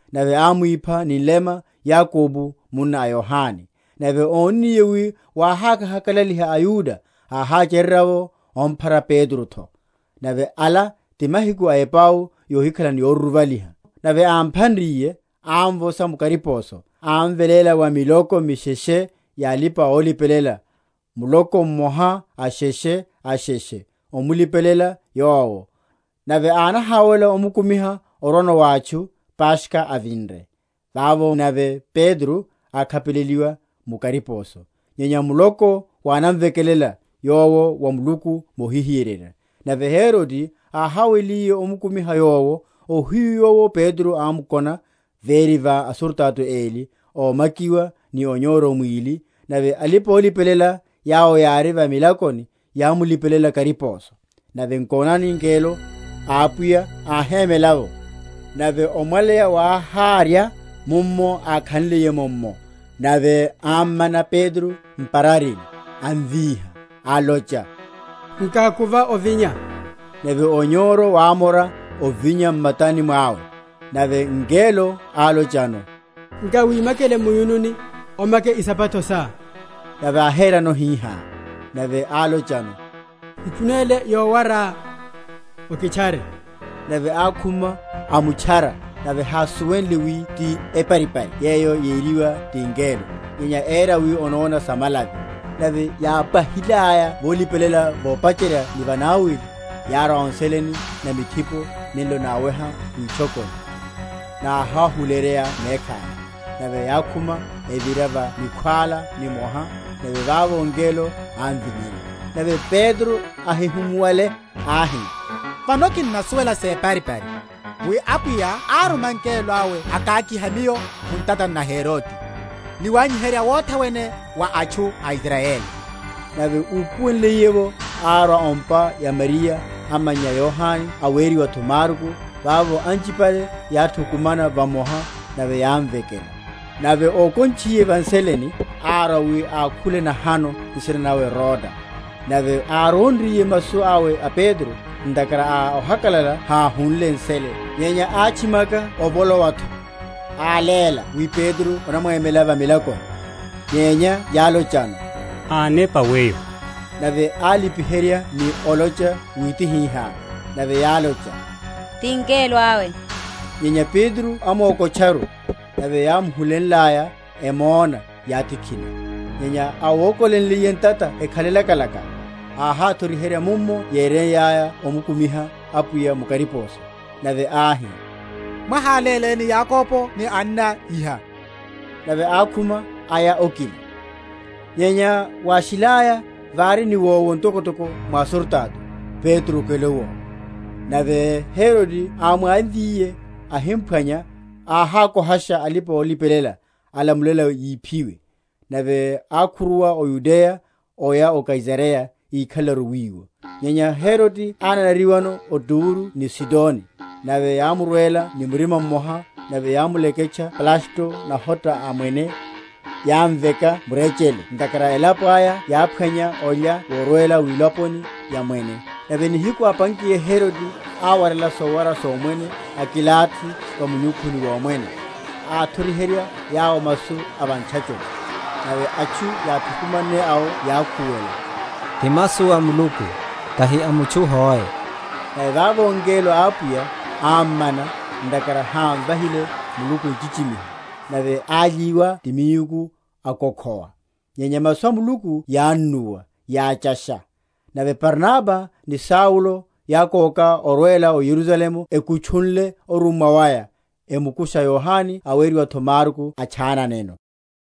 Nave ámwipha ni nlema Yakobo munna a Yohane. Nave ónniye wi wáháhakalaliha aYuda, áháchererya’vo amphara Petro’tho. Nave ala ti mahiku a epau yohikhala ni yoruruvaliha. Nave ámphanriye, ámvosha mu kariposo, amveléla wa miloko misheshe ya alipa‐olipelela, muloko mmoha asheshe asheshe, emulipelele yowo; nave ánahawela omukumiha orwano wa atchu, Paskha avinre. Vavo nave Petro ákhapeleliwa mu kariposo: nyenya muloko wánamvekelela yowo wa Muluku mohihiyererya. Nave Herode áháweliye omukumiha yowo, ohiyu yowo Petro ámkona véri va asurutato eli, ómakiwa ni onyoro mwili: nave alipa‐olipelela yawo yári va milakoni yámmulipelela kariposo. Nave nkonani, ngelo a Apwiya áhémela’vo, nave omwaleya wáharya mummo ákhanliye’mo’mmo; nave ámmana Petro m’pararini, amvíha, alocha, Nkákuva ovinya. Nave onyoro wámora ovinya m’matani mwawe. Nave ngelo álochano, Nkawimakele mu’yununi, omake isapato sá. Nave áhérano hihá. Nave álochano, Ikhunele yowará, okitchare. Nave ákhuma, amutchara; nave hásuwenle wi ti eparipari yeyo yeriwa ti ngelo, nyenya éra wi onóna sa malavi. Nave yápwahilaya volipelela vopacherya ni vanawili, yárwa o nseleni na mithipo nenlo náweha witchokoni; náháhuleyerya mekhaya: nave yákhuma, evira va nikhwála nimoha; nave vavo ngelo ámvinyerya. Nave Petro áhihimuwale, áhi, Vano kinnasuwela separipari, wi Apwiya áruma ngelo awe akakiha miyo mu ntatani na Herode, ni wanyiherya wothe wene wa atchu a Israyeli. Nave úpuwelenliye’vo, árwa o’mpa ya Mariya amannya a Yohane aweriwa’tho Marko; vavo anchipale yáthukumana vamoha, nave yámvekela. Nave ókontchiye va nseleni, árwa wi ákhule nahano, nsina nawe Roda. Nave áronriye masu awe a Petro, ntakhara a ohakalala háhunle nsele, nyenya átchimaka ovolowa’tho, áléla wi Petro onamwemela va milakoni. Nyenya yálochano, Ánepa weyo. Nave álipiherya ni olocha wi tihihá. Nave yálocha, Ti ngelo awe. Nyenya Petro ámokotcharu: nave yámuhulenlaya, emona, yátikhina. Nyenya áwokolenliye ntata ekhale lakalaka, áháthoriherya mummo yénraya omukumiha Apwiya mu kariposo. Nave áhi, Mwaháléleni Yakobo ni anna iha. Nave ákhuma, aya okina. Nyenya wáshilaya, vári niwowo ntokotoko mwa asurutato, Petro okele owi. Nave Herode ámwamvyiye, ahimphwanya, áhakohasha alipa‐olipelela, alamulela yiphiwe. Nave ákhuruwa o Yudeya oya o Kaisareya, íkhalelaru wiwo. Nyenya Herode ánanariwano ó Turo ni Sidoni; nave yámurwela ni murima mmoha, nave yámuleke?-?ntchaya Blasto nahota a mwene, yámveka murechele, ntakhara elapo aya yáphwanya olya worwela wilaponi ya mwene. Nave nihiku ápankiye Herode áwarela sowara somwene akilathi va munyukhuni womwene, athoriherya yawo masu a va ntchachoni. Nave atchu yáthukumanne awo yákhuwela, Ti masu a Muluku, tahi a mutchu hoe. Nave vavo ngelo a Apwiya ámmana, ntakhara hámvahile Muluku nchichimiho: nave ályiwa ti miuku, akokhowa. Nyenya masu a Muluku yánnuwa, yáchasha. Nave Barnaba ni Saulo yákóka orwela o Yerusalemu ekutchunle orummwa waya, emukusha Yohane aweriwa’tho Marko atchananeno.